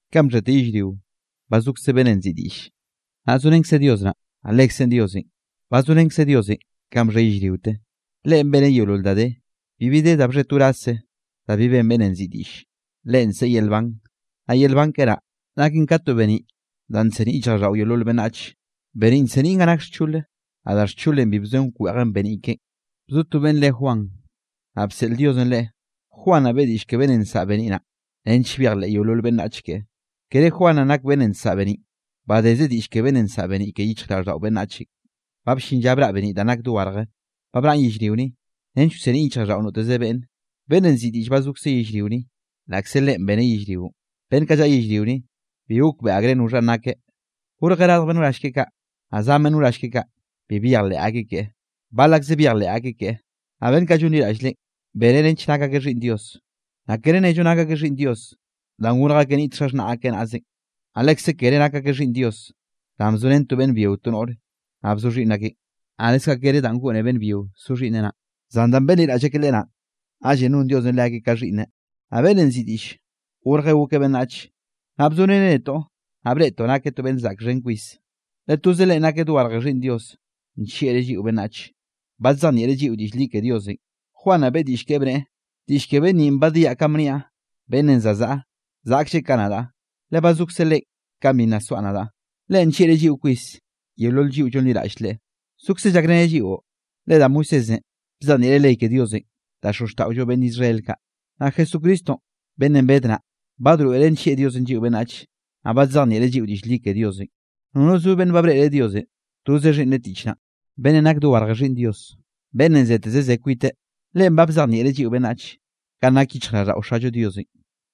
Kanꞌ bxhete yellrionꞌ, ba zokze beꞌnnenꞌ nziꞌi Diꞌlle, naꞌ zorenkzeꞌ Dios naꞌ, naꞌ Lekzeꞌn Diosenꞌ. Ba zorenkzeꞌ Diosenꞌ kanꞌ bxhe yellriote. Leꞌen beneꞌ yeolol da de. Bibi de, da bxhe to wrazze da bi ben beꞌnnenꞌ nziꞌi Diꞌll. Leꞌen nseꞌe yel nban, naꞌ yel nban keꞌe naꞌ, naken ka to beniꞌ danꞌ nseniꞌ yichjraꞌlldaꞌo yeolol beꞌnnach. Beniꞌn nseniꞌn ganꞌ nak xchole, naꞌ da xcholenꞌ bi bzoen wkweꞌjen beniꞌ keꞌen. Bzo to beꞌnn re Juan, naꞌ bseꞌl Diosenꞌ leꞌe. Juan naꞌ beꞌe diꞌll ke beꞌnnenꞌ nsaꞌa beniꞌ naꞌ, nench byejleꞌ yeolol beꞌnnach keꞌe. Kere Juan naꞌn nak beꞌnnenꞌ nsaꞌa beniꞌn, badezeꞌ diꞌll ke beꞌnnenꞌ nsaꞌa beniꞌ ke yichjraꞌlldaꞌo beꞌnnachenꞌ. Ba bllin lla braꞌ beniꞌ danꞌ nak dogarje, ba braꞌn yellrio ni, nench wseniꞌn yichjraꞌlldaꞌo noteze beꞌnne. Beꞌnnenꞌ nziꞌi Diꞌll ba zokzeꞌ yellrio ni. Laꞌkze Leꞌen beneꞌ yellrionꞌ, beꞌnn kaꞌ llaꞌa yellrio ni, bi gokbeꞌe akreꞌ noxhanꞌ nakeꞌ. Gorjeꞌ radj beꞌnn wrall keꞌe kaꞌ, naꞌ zan beꞌnn wrall keꞌe kaꞌ, bi byejleꞌ akeꞌ keꞌe. Bal akzeꞌ byejleꞌ akeꞌ keꞌe, naꞌ beꞌnn kaꞌ llonliraꞌll Leꞌen, beneꞌ nench nak akeꞌ xhiꞌnn Dios. Naꞌ kere nnello nak akeꞌ xhiꞌnn Dios danꞌ gorj akeꞌ niꞌt xaxhnaꞌ akeꞌ naꞌzenꞌ. Naꞌ lekze kere nak akeꞌ xhiꞌnn Dios, danꞌ bzorén to beꞌnn byio to noꞌre naꞌ bzo xhiꞌnn akeꞌn, naꞌ leskaꞌ kere danꞌ goꞌne beꞌnn byio so xhiꞌnneꞌ naꞌn; zan danꞌ benliraꞌll akeꞌ Leꞌe naꞌ, naꞌllenꞌ non Diosenꞌ leakeꞌ ka xhiꞌnneꞌ. Naꞌ beꞌnnenꞌ nziꞌi Diꞌll gorjeꞌ gokeꞌ beꞌnnach, naꞌ bzoreneꞌ netoꞌ. Naꞌ breꞌtoꞌ nakeꞌ to beꞌnn zaꞌk xhen kwis, le toze Leꞌen nakeꞌ dogarje Xhiꞌnn Diosenꞌ, nllieꞌreꞌ lliꞌo beꞌnnach, badzejnieꞌreꞌ lliꞌo diꞌll li ke Diosenꞌ. Juan naꞌ beꞌe diꞌll keꞌe, bneꞌe: —Diꞌll ke beꞌnn ninꞌ badiaꞌ kanꞌ bniaꞌn: “Beꞌnnenꞌ za zaꞌa, zaꞌklleꞌ ka nadaꞌ, le ba zokze Leꞌen kanꞌ bi nna soaꞌ nadaꞌ.” Leꞌen nllieꞌreꞌ lliꞌo kwis yeolol lliꞌo llonliraꞌll Leꞌe, zokzeꞌ llakreneꞌ lliꞌo. Le da Moisésenꞌ bzejnieꞌreꞌ ley ke Diosenꞌ da xozxtaꞌollo beꞌnn Israel kaꞌ, naꞌ Jesucristonꞌ beꞌnnenꞌ bed naꞌ, badroeꞌre nllieꞌ Diosenꞌ lliꞌo beꞌnnach, naꞌ badzejnieꞌreꞌ lliꞌo diꞌll li ke Diosenꞌ. Nono zo beꞌnn ba breꞌreꞌ Diosenꞌ, toze Xhiꞌnneꞌ tiꞌch naꞌ, beꞌnnenꞌ nak dogarje Xhiꞌnn Dios beꞌnnenꞌ zeteze zeꞌe kwiteꞌ, Leꞌen ba bzejnieꞌreꞌ lliꞌo beꞌnnach, kanꞌ nak yichjraꞌlldaꞌo Xallo Diosenꞌ.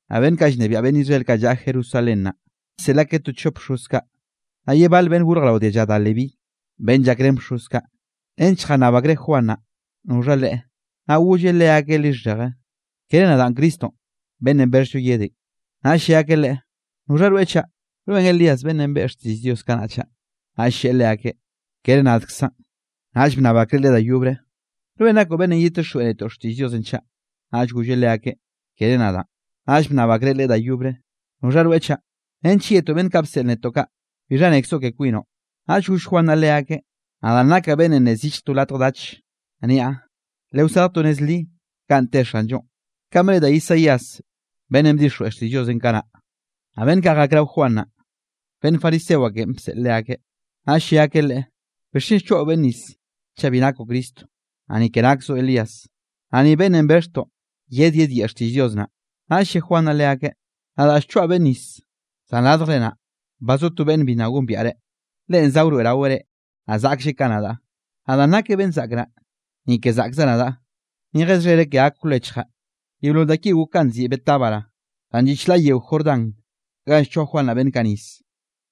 Naꞌ beꞌnn kaꞌ llnebiaꞌ beꞌnn Israel kaꞌ llaꞌa Jerusalén naꞌ, bseꞌl akeꞌ to chop bxoz kaꞌ, naꞌ ye bale beꞌnn gorje rao dialla da Leví, beꞌnn llakrén bxoz kaꞌ, nench jannab akreꞌ Juan naꞌ noxha leꞌe. Naꞌ golleꞌ leakeꞌ lixheje: —Kere nadaꞌn Cristonꞌ beꞌnnenꞌ bexhllo yedenꞌ. Naꞌll lle akeꞌ leꞌe: —¿Noxha rweꞌ chaꞌ? ¿Rweꞌn Elías beꞌnnenꞌ beꞌe xtiꞌll Dios kanaꞌ chaꞌ? Naꞌll lleꞌe leakeꞌ: —Kere nadkzaꞌn. Naꞌll bnnab akreꞌ leꞌe da yobre: —¿Rweꞌn nakoꞌ beꞌnnenꞌ yedtixjweꞌ netoꞌ xtiꞌll Dios chaꞌ? Naꞌll golleꞌ leakeꞌ: —Kere nadaꞌn. Naꞌll bnnab akreꞌ leꞌe da yobre: —¿Noxha rweꞌ chaꞌ? Nench yetoꞌ beꞌnn kaꞌ bseꞌl netoꞌ kaꞌ. ¿Bixha nekzoꞌ ke kwinoꞌ? Naꞌll goll Juan naꞌ leakeꞌ: —Nadaꞌn nakaꞌ beꞌnn nne zillj to latj dach, niaꞌ: “Lewasarj to nez li ganꞌ te Xanllonꞌ”, kanꞌ bne da Isaías beꞌnnenꞌ bdixjweꞌ xtiꞌll Diosenꞌ kanaꞌ. Naꞌ beꞌnn kaꞌ jak rao Juan naꞌ, beꞌnn fariseo akeꞌn bseꞌl leakeꞌ. Naꞌll lle akeꞌ leꞌe: —¿Bixchen llchoaꞌo beꞌnne nis, chaꞌ bi nakoꞌ Cristo, naꞌ ni ke nakzoꞌ Elías, naꞌ ni beꞌnnenꞌ bexhtoꞌ yed yedyeꞌe xtiꞌll Dios naꞌ? Naꞌll lle Juan naꞌ leakeꞌ: —Nadaꞌ llchoaꞌ beꞌnne nis, zan radjre naꞌ, ba zo to beꞌnne bi nna gombiaꞌre. Leꞌen za wroeꞌraweꞌ reꞌ, naꞌ zaꞌklleꞌ ka nadaꞌ, naꞌ danꞌ nakeꞌ beꞌnn zaꞌk naꞌ, ni ke zaꞌkzaꞌ nadaꞌ, ni jeze xhereꞌ ke gak wlechjaꞌ. Yeolol da kinꞌ gok ganꞌ nziꞌi Betábara, danꞌ lliꞌ chlaꞌ yeo Jordán ganꞌ llchoa Juan naꞌ beꞌnn kaꞌ nis.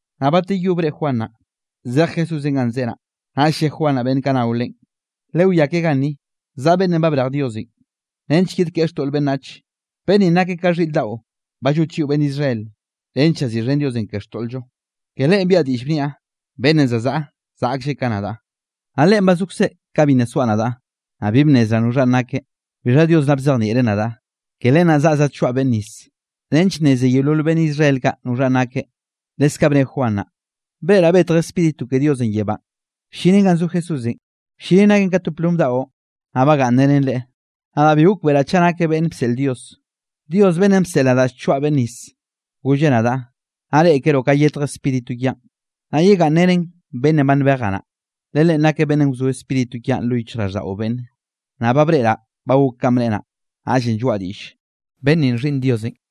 Naꞌ bateyó breꞌe Juan naꞌ, zej Jesúsenꞌ ganꞌ zeꞌe naꞌ, naꞌll lle Juan naꞌ beꞌnn kaꞌ nao leꞌen: —Lewiá ke ganni zaꞌa beꞌnnenꞌ ba brej Diosenꞌ, nench yedkeꞌe xtoꞌl beꞌnnach. Beꞌnn ninꞌ nakeꞌ ka xhiꞌr daꞌo ba llot lliꞌo beꞌnn Israel, nench llaziꞌxhen Diosenꞌ ke xtoꞌl-llo. Ke Leꞌen biaꞌa diꞌll, bniaꞌ: “Beꞌnnenꞌ za zaꞌa zaꞌklleꞌ ka nadaꞌ, naꞌ Leꞌen ba zokzeꞌ ka bi nna soaꞌ nadaꞌ.” Naꞌ bi bnnezraꞌ noxhanꞌ nakeꞌ, bixha Dios naꞌ bzejnieꞌreꞌ nadaꞌ, ke len naꞌ zaꞌa zadchoaꞌ beꞌnne nis, nench nneze yeolol beꞌnn Israel kaꞌ noxhanꞌ nakeꞌ. Leskaꞌ bne Juan naꞌ: —Breꞌraꞌ betj Spíritu ke Diosenꞌ yebánꞌ, bllinen ganꞌ zo Jesúsenꞌ. Bllinen naken ka to plom daꞌo, naꞌ bagaꞌnnrenen Leꞌe. Nadaꞌ bi gokbeꞌraꞌ chaꞌ nakeꞌ beꞌnnenꞌ bseꞌl Dios, Dios beꞌnnenꞌ bseꞌl nadaꞌ llchoaꞌ beꞌnne nis golleꞌ nadaꞌ: “Nnaꞌ reꞌkeroꞌ ka yetj Spíritu kiaꞌn, naꞌ yegaꞌnnrenen beꞌnnenꞌ ba nbejaꞌ naꞌ. Le leꞌen nakeꞌ beꞌnnenꞌ wzo Spíritu kiaꞌn lo yichjraꞌlldaꞌo beꞌnne.” Naꞌ ba breꞌraꞌ ba gok kanꞌ bneꞌe naꞌ, naꞌllenꞌ lloaꞌ diꞌll, beꞌnn ninꞌ Xhiꞌnn Diosenꞌ.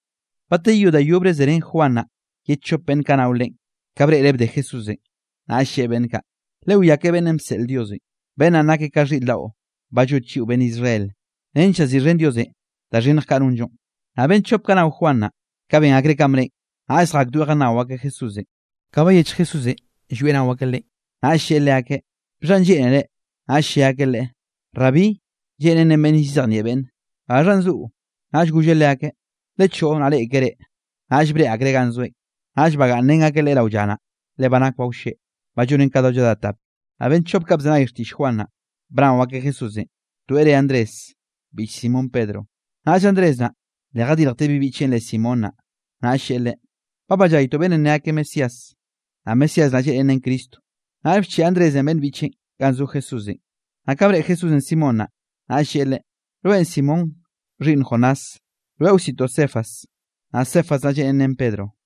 Bateyó da yobre zerén Juan naꞌ ye chop beꞌnn kaꞌ nao Leꞌen. Ka breꞌreꞌ bde Jesúsenꞌ, naꞌll lleꞌe beꞌnn kaꞌ: —Lewiá ke beꞌnnenꞌ bseꞌl Diosenꞌ, beꞌnn naꞌn nakeꞌ ka xhiꞌr daꞌo banꞌ llot lliꞌo beꞌnn Israel, nench llaziꞌxhen Diosenꞌ da xhinnj kaꞌ nonllo. Naꞌ beꞌnn chop kaꞌ nao Juan naꞌ, ka ben akreꞌ kanꞌ bneꞌen, naꞌll zjakdoeꞌ jannao akeꞌ Jesúsenꞌ. Ka bayechj Jesúsenꞌ llwieꞌ nao akeꞌ Leꞌen, naꞌll lleꞌe leakeꞌ: —¿Bixhanꞌ lleꞌnere? Naꞌll lle akeꞌ Leꞌe: —Rabí (lleꞌnen nen beꞌnn llzejnieꞌ beꞌnne), ¿gaxhanꞌ zoꞌo? Naꞌll golleꞌ leakeꞌ: —Lechoꞌo naꞌ reꞌkere. Naꞌll byejrén akeꞌ Leꞌe, naꞌll breꞌe akreꞌ ganꞌ zoeꞌn, naꞌll bagaꞌnnrén akeꞌ Leꞌe rao lla naꞌ, le ba nak ba wlleꞌ, ba llonen ka do lladá tap. Naꞌ beꞌnn chop kaꞌ bzenay xtiꞌll Juan naꞌ, bnao akeꞌ Jesúsenꞌ, toeꞌ re Andrés, biꞌch Simón Pedronꞌ. Naꞌll Andrés naꞌ, le jadirjteꞌ bi biꞌcheꞌn re Simón naꞌ. Naꞌll lleꞌe leꞌe: —Ba ballaytoꞌ beꞌnnenꞌ ne akeꞌ Mesías. (Naꞌ Mesías naꞌ lleꞌnen nen Cristo.) Naꞌll bcheꞌe Andrésenꞌ beꞌnn biꞌcheꞌn ganꞌ zo Jesúsenꞌ. Naꞌ ka breꞌe Jesúsenꞌ Simón naꞌ, naꞌll lleꞌe leꞌe: —Rweꞌn Simón xhiꞌnn Jonás, rweꞌ wsiꞌtoꞌ Cefas. (Naꞌ Cefas naꞌ lleꞌnen nen Pedro.)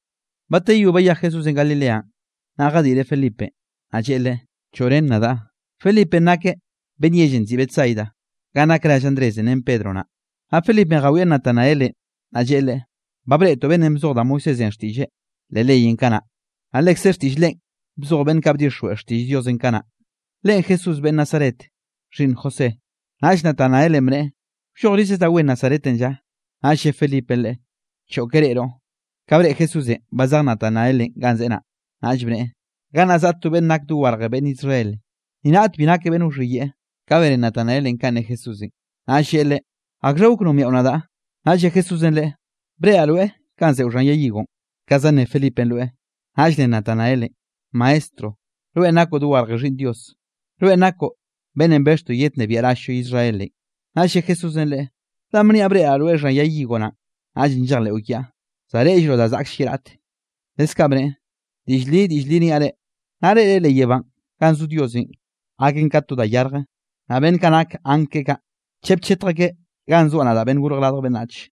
Bateyó bayej Jesúsenꞌ Galileanꞌ, naꞌ jadiꞌreꞌ Felipenꞌ, naꞌ lleꞌe leꞌe: —Choꞌ ren nadaꞌ. Felipenꞌ nakeꞌ beꞌnn yellenꞌ nziꞌi Betsaida ganꞌ nak rall Andrésenꞌ, ren Pedro naꞌ. Naꞌ Felipenꞌ jawieꞌ Natanaelenꞌ, naꞌll lleꞌe leꞌe: —Ba breꞌtoꞌ beꞌnnenꞌ bzoj da Moisésenꞌ xtiꞌlleꞌ leꞌ leyenꞌ kanaꞌ, naꞌ lekze xtiꞌll Leꞌen bzoj beꞌnn kaꞌ bdixjweꞌ xtiꞌll Diosenꞌ kanaꞌ. Leꞌen Jesús beꞌnn Nazaret, xhiꞌnn José. Naꞌll Natanaelenꞌ bneꞌe: —¿Wllojrize da wen Nazaretenꞌ lla? Naꞌll lle Felipenꞌ leꞌe: —Choꞌ ke reꞌroꞌ. Ka breꞌe Jesúsenꞌ ba zej Natanaelenꞌ ganꞌ zeꞌe naꞌ, naꞌll bneꞌe: —Gannaꞌ zaꞌa to beꞌnn nak dogarje beꞌnn Israel, ni raꞌt bi nakeꞌ beꞌnn wxhiyeꞌe. Ka bene Natanaelenꞌ kanꞌ ne Jesúsenꞌ, naꞌll lleꞌe Leꞌe: —¿Akxha gok nombiaꞌo nadaꞌ? Naꞌll lle Jesúsenꞌ leꞌe: —Breꞌraꞌ rweꞌ kanꞌ zeꞌo xhan yay higonꞌ, kanꞌ za nne Felipenꞌ rweꞌ. Naꞌll ne Natanaelenꞌ: —Maestro, rweꞌn nakoꞌ dogarje Xhiꞌnn Dios. Rweꞌn nakoꞌ beꞌnnenꞌ bexhtoꞌ yednnebiaꞌ rall-llo Israelenꞌ. Naꞌll lle Jesúsenꞌ leꞌe: —¿Danꞌ niaꞌ breꞌraꞌ rweꞌ xhan yay higo naꞌn, naꞌllenꞌ llejleꞌo kiaꞌ? Za reꞌllroꞌ da zaꞌkll ye raꞌte. Leskaꞌ bneꞌe: —Diꞌll li, diꞌll li niaꞌ reꞌ: Nnaꞌ reꞌre leꞌ yebánꞌ ganꞌ zo Diosenꞌ gaken ka to da yarje, naꞌ beꞌnn kaꞌ nak angl keꞌe kaꞌ, chep chetj akeꞌ ganꞌ zoaꞌ nadaꞌn Beꞌnn Gorj Radj Beꞌnnach.